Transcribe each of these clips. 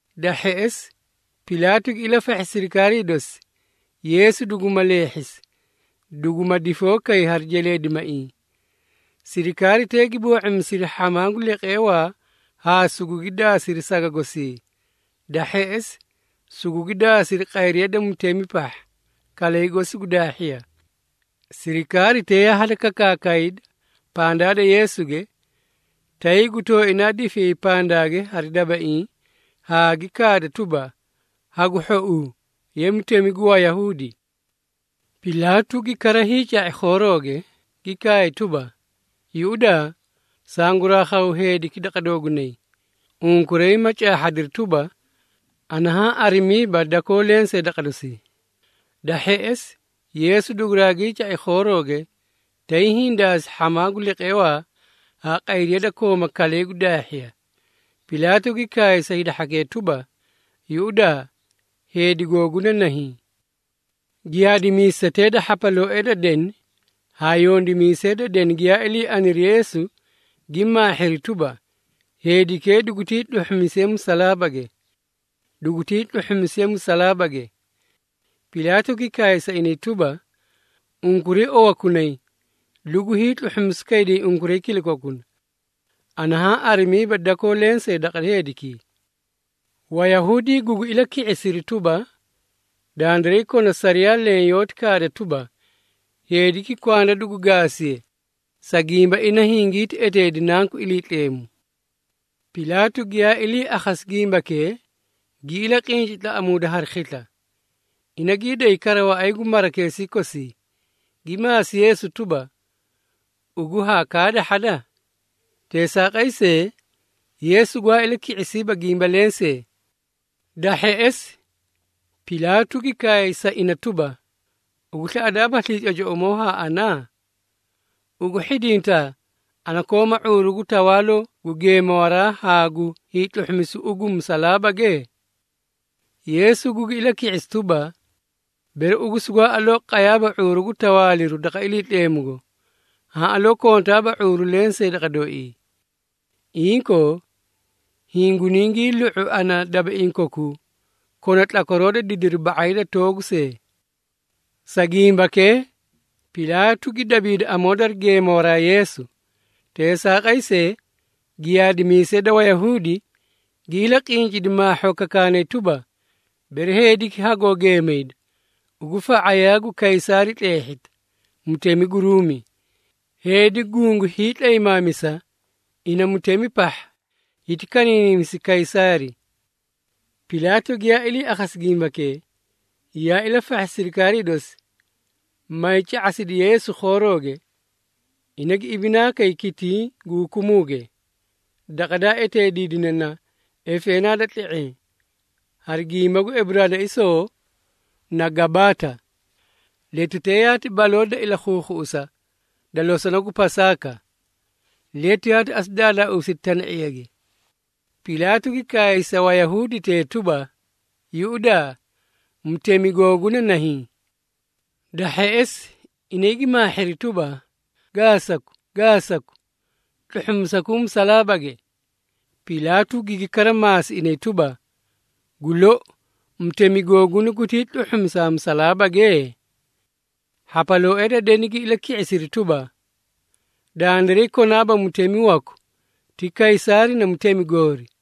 Da hheꞌesi, Pilaatu gi ilafahhi sirikaarii dosi, Yeesu duguma leehhisi, duguma difoo kay hari jeleedimaiĩ. Sirikaaritee gi boo⁄imisidi hhamaa gu leqeewaa haa sugugi daasiri saga gosii. Da hheꞌesi, sugugi daasiri qayriya da mutemi pahha, kalay gosi gu daahhiya. Sirikaaritee yaa hadakakaakayda pandaa da Yeesuge, tay gu tooinaa difiyay pandaage hari dabaiĩ haa gi kaadi tuba, “Hagu hhouu, ye Mutemi gu Wayahuudi!” Pilaatu gi kara hiica⁄i khoorooge, gi kaay tuba, “Yuꞌudaa, sanguraa khaw heediki daqa doogunay, unkuray ma caahhadiri tuba, ana haã arimiiba dakoo lensee daqa dosii.” Da hheꞌesi, Yeesu duguraagii ca⁄i khoorooge, tay hiĩ daasi hhamaa gu leqeewaa haa qayriya da koomaa kalay gu daahhiya. Pilaatu gi kaay sa hida hhakee tuba, “Yuꞌudaa! Heedi googuna nahiĩ!” Giyaadimiisetee da hhapalooee da deni haa yondimiisee da deni giyaa ilii aniri Yeesu gi maahhiri tuba, “Heedikee dugutii tluhhumisiye musalaabage! Dugutii tluhhumisiye musalaabage!” Pilaatu gi kaay sa inay tuba, “Unkuray owakunay, lugu hiitluhhumisu kayday unkuray kilakokuna. Ana haã arimiiba dakoo lensee daqa heedikii.” Wayahuudi gugi ilaki⁄isiri tuba, “Dandiray kona sariyaa leẽ yoóti kaada tuba, heediki kwanda dugu gaasiye, sa gimba ina hingiti eteedi Nanku Iliitleemu.” Pilaatu giyaa ilii akhasi gimbakee, gi ilaqinci tlaꞌamuuda hari khisla. Ina gii day kara waꞌay gu marakeesii kosi, gi maasi Yeesu tuba, “Ugu haa kaadahhada?” Teesaaqay see, Yeesu gwaa ilaki⁄isiiba gimba lensee. Da hheꞌesi, Pilaatu gi kaay sa ina tuba, “Ugu slaꞌadaabaslii cocoꞌomoo haa ana? Ugu hhidinta, ana kooma ⁄uuru gu tawaaloo gu geemawaraa haa gu hiitluhhumisu ugu musalaabage?” Yeesu gugi ilaki⁄isi tuba, “Bere ugu sugwaa aloo qayaaba ⁄uuru gu tawaaliru daqa Iliitleemugo, haã aloo kontaaba ⁄uuru lensee daqa dooii. Inkoo, hiĩ guunii lu⁄u ana dabaiĩ kokuu kona tlakwaroo da didiri ba⁄ay da toogu see.” Sa gimbakee, Pilaatu gi dabiidi amoo dari geemawaraa Yeesu. Teesaaqay see, giyaadimiisee da Wayahuudi gi ilaqincidi maahhoo kakaanay tuba, “Bere heediki hagoo geemayda, ugu fa⁄ayaa gu Kaysaari tleehhita, mutemi gu Ruumi. Heedi gungu hiitlaymaamisa ina mutemi pahha, hiti kaniinimisi Kaysaari!” Pilaatu giyaa ilii akhasi gimbakee, yaa ilafahhi sirikaarii dosi, maay ca⁄asidi Yeesu khoorooge. Ina gi ibinaa kay kitiĩ gu hukumuuge, daqa daa eteediidine na, “Efeenaa da Tle⁄eẽ,” hari gimba gu Eburaanaisoo na “Gabaata.” Letutee yaati baloo da ilakhuukhuꞌusa da losona gu Pasaaka, letu yaati asu daadaausidi tana⁄iyage. Pilaatu gi kaay sa Wayahuuditee tuba, “Yuꞌudaa! Mutemi googuna nahiĩ!” Da hheꞌesi, inay gi maahhiri tuba, “Gaasaku! Gaasaku! Tluhhusakuu musalaabage!” Pilaatu gigi kara maasi inay tuba, “Gu lou, mutemi googuna gutii tluhhusaa musalaabage?” Hhapalooee da deni gi ilaki⁄isiri tuba, “Dandiray konaaba mutemi waku ti Kaysaari na mutemi goori!”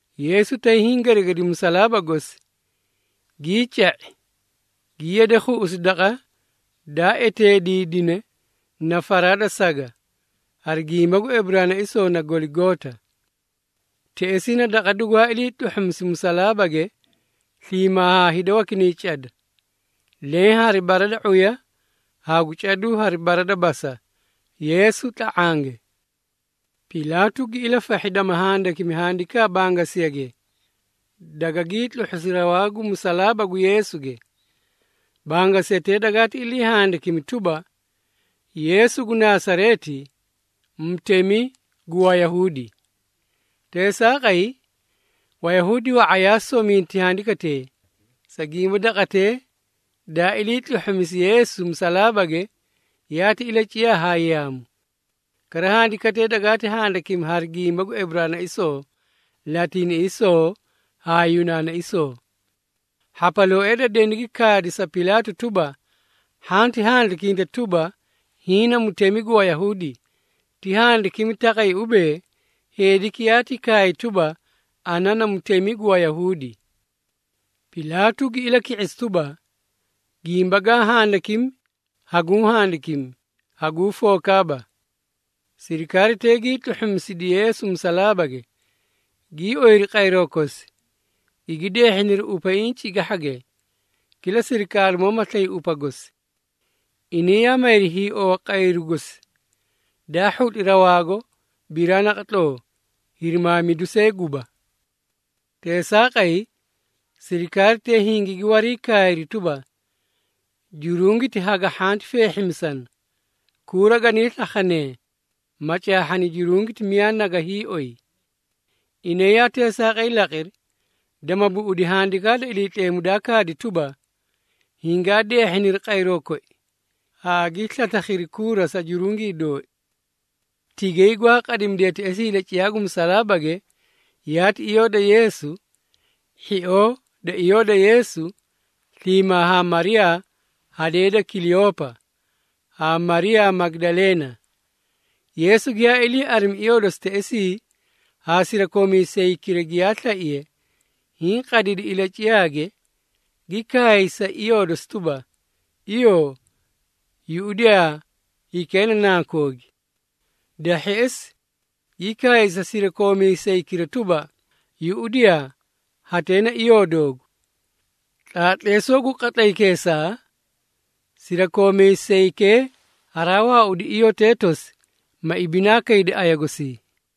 Yeesu tay hiĩ geregedi musalaaba gosi, gii ca⁄i, gi yade khuꞌusi daqa daa eteediidine na “Faraa da Saga,” hari gimba gu Eburaanaisoo na “Goligoota.” Teꞌesii na daqa dugwaa ilii tluhhumisi musalaabage sliimaa haa hida wakinay cada, leẽ hari bara da ⁄uya haa gu caduu hari bara da basa, Yeesu tla⁄ange. Pilaatu gi ilafahhi dama handikimi handikaa bangasiyage, dagagii tluhhusi rawaa gu musalaaba gu Yeesuge. Bangasiyatee dagaati ilii handikimi tuba, “YEESU GU NASAREETI, MUTEMI GU WAYAHUUDI.” Teesaaqay, Wayahuudi wa⁄a yaa sominti handikatee, sa gimba daqatee daa ilii tluhhumisi Yeesu musalaabage, yaati ilaciyaa haa yaamu. Kara, handikatee dagaati handikimi hari gimba gu Eburaanaisoo, Latiiniꞌisoo haa Yunaanaisoo. Hhapalooee da deni gi kaadi sa Pilaatu tuba, “Hhanti handikinta tuba, ‘Hiĩ na Mutemi gu Wayahuudi.’ Ti handikimi taqay ubee, ‘Heediki yaati kaay tuba, ana na Mutemi gu Wayahuudi!’” Pilaatu gi ilaki⁄isi tuba, “Gimba gaa handikimi, haguũ handikimi, haguu fookaaba.” Sirikaaritee gii tluhhumisidi Yeesu musalaabage, gii oyiri qayroo kosi, gigi deehhiniri upaiĩ cigahhage, kila sirikaarimoo ma slay upa gosi. Inay yaa mayri hiiowa qayru gosi, daa hhutli rawaago biraa naqatloo, hirimaamidu see guba. Teesaaqay, sirikaaritee hingigi warii kaayri tuba, “Jurungiti haga hhanti feehhimisana, kuura ganii slakhanee, ma caahhani jurungiti miyaa naga hiioy.” Inay yaa teesaaqay laqiri, dama buꞌudi Handikaa da Iliitleemu, daa kaadi tuba, “Hingaa deehhiniri qayroo koi, haa gii slaslakhiri kuura sa jurungii dooi.” Tigay gwaa qadimidee teꞌesii ilaciyaa gu musalaabage yaati iyoo da Yeesu, hhioo da iyoo da Yeesu, sliimaa haa Mariyaa hadee da Kileyoopa, haa Mariyaa Magidaleena. Yeesu giyaa ilii arimi iyoo dosi teꞌesii haa sirakoomiisaykira giyaa slaiye, hiĩ qadidi ilaciyaage, gi kaay sa iyoo dosi tuba, “Iyoo! Yuꞌudiyaa, hikee na nankoogi.” Da hheꞌesi, gi kaay sa sirakoomiisaykira tuba, “Yuꞌudiyaa! Hatee na iyoo doogu!” Tlaatleesoo gu qatlaykeesaa, sirakoomiisaykee haraa waaudi iyotee tosi, ma ibinaa kaydi aya gosii.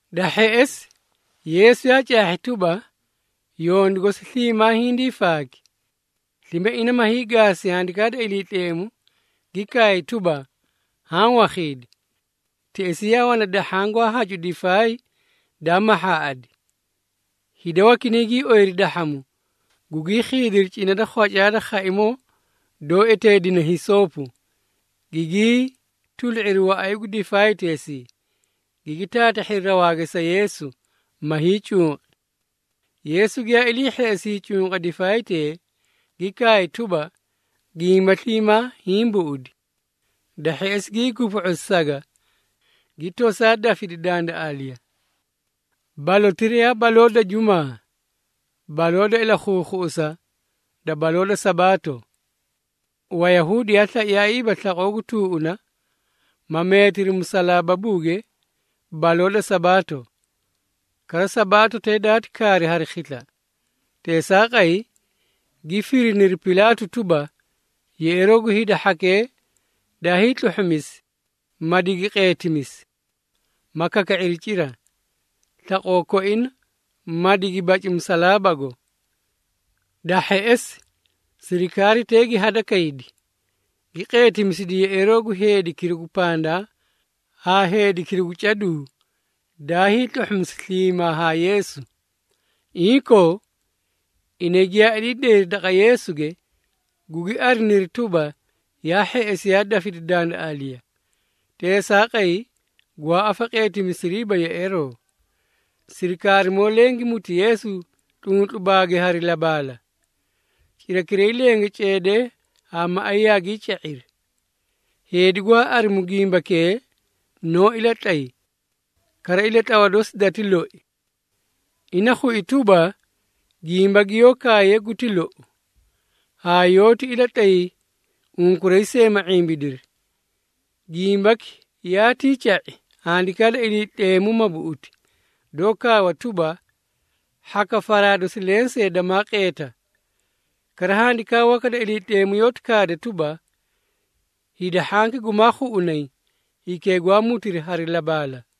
Da hheꞌesi, Yeesu yaa caahhi tuba, yondu gosi sliimaa hindii faaki. Slime ina ma hiigaasi Handikaa da Iliitleemu, gi kaay tuba, “Haã wakhiidi.” Teꞌesii yaa wana dahhaã gwaa hacu difaay daa mahhaaꞌadi. Hida wakinay gii ooyiri dahhamu, gugii khiidiri cina da khwacaa da khaimoo doó eteedine hisoopo, gigii tulu⁄iri waꞌay gu difaayteesii, gigi taatahhiri rawaage sa Yeesu, ma hiicunqi. Yeesu giyaa ilii hheꞌesi hiicunqa difaaytee, gi kaay tuba, “Gimba sliimaa hiĩ buꞌudi.” Da hheꞌesi, gii gupu⁄usi saga, gi tosaa dafidi dandaꞌaaliya. Balotira yaa baloo da Jumaa, baloo da ilakhuukhuꞌusa da baloo da Sabaato. Wayahuudi yaa slaiyaaiiba slaqoo gu tuuꞌuna, ma meetiri musalaababuuge baloo da Sabaato. Kara, Sabaatotee daati kaari hari khisla. Teesaaqay, gi firiniri Pilaatu tuba, yeꞌeeroo gu hida hhakee daa hiitluhhumisi, ma digi qeetimisi, ma kaka⁄iri cira, slaqoo koina, ma digi baci musalaababuugo. Da hheꞌesi, sirikaaritee gi hadakaydi, gi qeetimisidi yeꞌeeroo gu heedikira gu pandaa haa heedikira gu caduu daa hiitluhhumisi sliimaa haa Yeesu. Inkoo, inay giyaa ilii dayri daqa Yeesuge, gugi ariniri tuba, yaa hheꞌesi yaa dafidi dandaꞌaaliya. Teesaaqay, gwaa afaqeetimisiriiba yeꞌeeroo. Sirikaarimoo leẽ gi muti Yeesu tluntlubaage hari labaala. Cirakiray lenge ceedee haa maꞌay yaagii ca⁄iri. Heedi gwaa arimu gimbakee noó ilatlay, kara ilatlawa dosi dati loi. Ina khui tuba, gimba giyoó kaaye guti lou, haa yoóti ilatlay unkuray see slime ma ⁄imbidiri. Gimbaki yaatii ca⁄i, Handikaa da Iliitleemu ma buꞌuti, doó kaawa tuba, “Hhaka faraa dosi lensee damaa qeeta.” Kara, Handikaa waka da Iliitleemu yoóti kaada tuba, “Hida hhanki gumaa khuꞌunay hikee gwaa mutiri hari labaala.”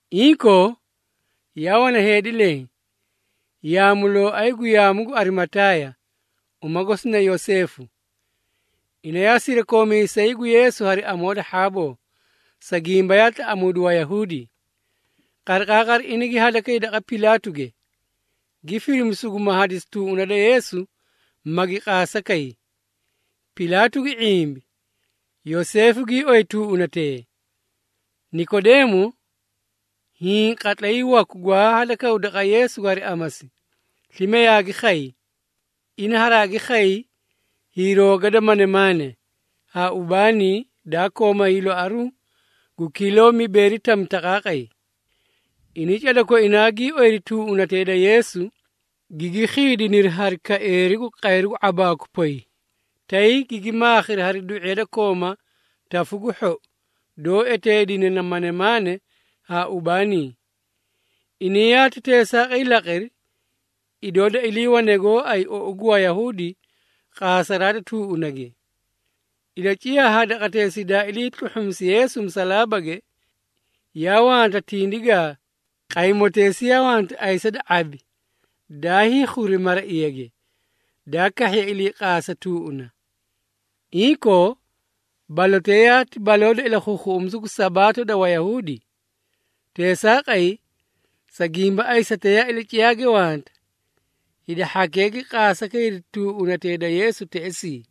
Inkoo, yaa wana heedi leẽ, yaamulooay gu yaamu gu Arimataaya, uma gosi na Yoseefu. Ina yaa sirakoomiisay gu Yeesu hari amoo da hhaaboo, sa gimba yaa tlaꞌamuudi Wayahuudi. Qariqaaqari ina gi hadakay daqa Pilaatuge, gi firimi suguma hadisi tuuꞌuna da Yeesu, magi qaasa kay. Pilaatu gi ⁄imbi, Yoseefu gii oyi tuuꞌunatee. Nikodeemo, hiĩ qatlay waku gwaa hadakaw daqa Yeesuge hari amasi, slime yaagi khay. Ina haraagi khay hiirooga da manemaane, haa ubaanii, daa kooma hiiloaruũ gu kiloo mibeeri tami taqaaqay. Inay cada koinaa gii oyiri tuuꞌunatee da Yeesu, gigi khiidiniri hari kaeeri gu qayru gu ⁄abaaku poy, tay gigi maakhiri hari du⁄iya da kooma tafu gu hhou, doó eteedine na manemaane haa ubaanii. Inay yaati teesaaqay laqiri, idoo da iliiwane gooay ou gu Wayahuudi qaasaraa da tuuꞌunage. Ilaciyaa haa daqateesii daa ilii tluhhumisi Yeesu musalaabage, yaa wanta tindigaa. Qaymoteesii yaa wanta ayisa da ⁄abi daa hiikhuri maraiyage, daa kahhiye ilii qaasaraa tuuꞌuna. Inkoo, balotee yaati baloo da ilakhuukhuꞌumisu gu Sabaato da Wayahuudi. Teesaaqay, sa gimba ayisatee yaa ilaciyaage wanta, hida hhakee gi qasaa kayri tuuꞌunatee da Yeesu teꞌesii.